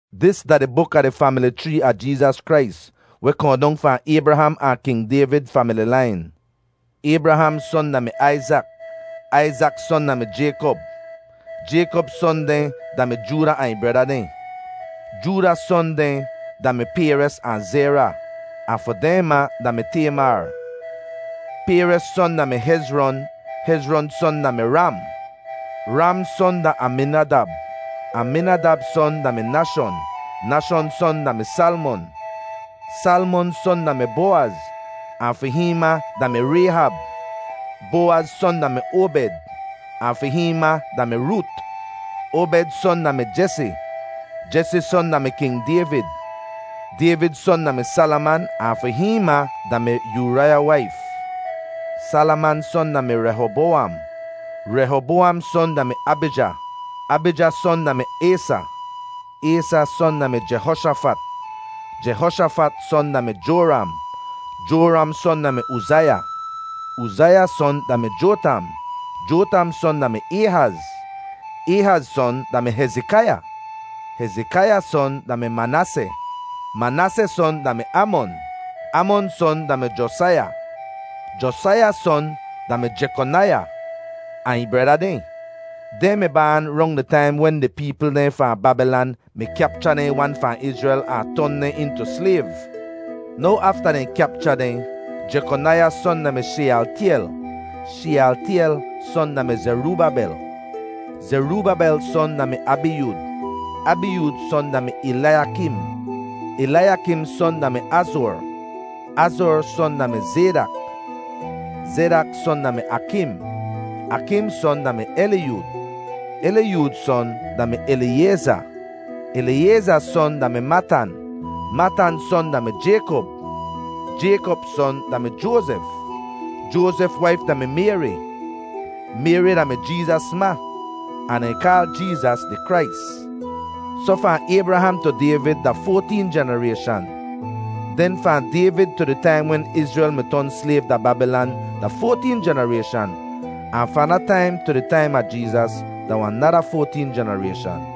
Dis da di buk a di famili chree a Jeezas Krais, weh kohn dong fahn Aybraham ahn King Dayvid famili lain. Aybraham son da-mi Aizak. Aizak son da-mi Jaykop. Jaykop son dehn da-mi Jooda ahn ih breda dehn. Jooda son dehn da-mi Payres ahn Zera, ahn fi dehn ma da-mi Taymar. Payres son da-mi Hezron. Hezron son da-mi Ram. Ram son da-mi Aminadab. Aminadab son da-mi Nashon. Nashon son da-mi Salmon. Salmon son da-mi Bowaz, ahn fi hihn ma da-mi Rayhab. Bowaz son da-mi Obed, ahn fi hihn ma da-mi Root. Obed son da-mi Jesi, Jesi son da-mi King Dayvid. Dayvid son da-mi Salaman, ahn fi hihn ma da-mi Uraiya waif. Salaman son da-mi Rehobowam. Rehobowam son da-mi Abija. Abija son da-mi Aysa. Aysa son da-mi Jehoshafat. Jehoshafat son da-mi Joram. Joram son da-mi Uzaiya. Uzaiya son da-mi Jotam. Jotam son da-mi Ayhaz. Ayhaz son da-mi Hezikaiya. Hezikaiya son da-mi Manaaseh. Manaaseh son da-mi Amon. Amon son da-mi Josaiya. Josaiya son da-mi Jekonaiya ahn ih breda dehn. Dehn mi baan rong di taim wen di peepl dehn fahn Babilan mi kyapcha dehn wan fahn Izrel ahn ton dehn intu slayv. Now afta dehn kyapcha dehn: Jekonaiya son da-mi Sheyaltyel. Sheyaltyel son da-mi Zerubabel. Zerubabel son da-mi Abiyud. Abiyud son da-mi Elaiyakim. Elaiyakim son da-mi Azor. Azor son da-mi Zaydak. Zaydak son da-mi Akim. Akim son da-mi Eliyud. Eliyud son da-mi Eliyayza. Eliyayza son da-mi Matan. Matan son da-mi Jaykop. Jaykop son da-mi Joazef. Joazef waif da-mi Mayri. Mayri da-mi Jeezas ma. Ahn dehn kaal Jeezas di Krais. Soh fahn Aybraham tu Dayvid da foateen jenarayshan. Den fahn Dayvid tu di taim wen Izrel mi ton slayv da Babilan da foateen jenarayshan. Ahn fahn da taim tu di taim a Jeezas da wahn nada foateen jenarayshan.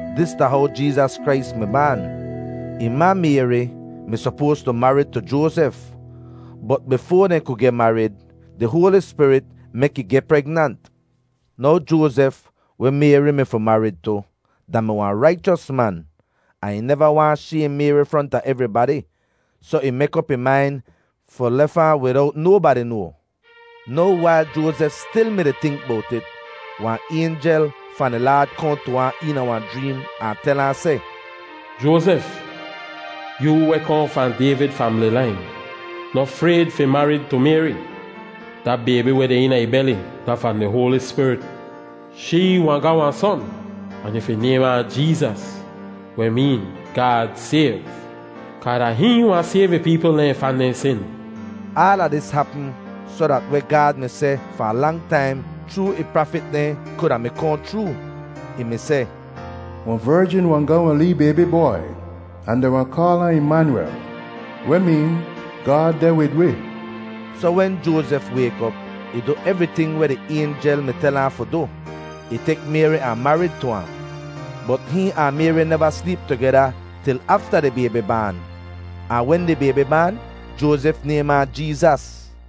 Dis da how Jeezas Krais mi baan. Ih ma Mayri mi sopoas tu marid tu Joazef, bot bifoa dehn ku geh marid, di Hoali Spirit mek ih geh pregnant. Now Joazef weh Mayri mi fi marid tu, da-mi wahn raichos man, ahn ih neva waahn shaym Mayri fronta evribadi, soh ih mek op ih main fi lef ahn widowt nobadi noa. Now wail Joazef stil mi-di tink bowt it, wahn aynjel fahn di Laad kohn tu ahn eena wahn jreem ahn tel ahn seh, “Joazef, yoo weh kohn fahn Dayvid famili lain, noh frayd fi marid tu Mayri. Da baybi weh deh eena ih beli da fahn di Hoali Spirit. Shee wahn ga wahn son, ahn yu fi naym ahn Jeezas, weh meen ‘Gaad sayv,’ kaa da hihn wahn sayv ih peepl dehn fahn dehn sin.” Aala dis hapm soh dat weh Gaad mi seh fahn lang taim chroo ih prafit dehn kuda mi kohn chroo. Ih mi seh, “Wahn verjin wahn ga wahn lee baybi bwai, ahn dehn wahn kaal ahn Imanyuwel,” weh meen “Gaad deh wid wi.” Soh wen Joazef wayk op, ih du evriting weh di aynjel mi tel ahn fi du. Ih tek Mayri ahn marid tu ahn. Bot hihn ahn Mayri neva sleep tugeda til afta di baybi baan; ahn wen di baybi baan, Joazef naym ahn Jeezas.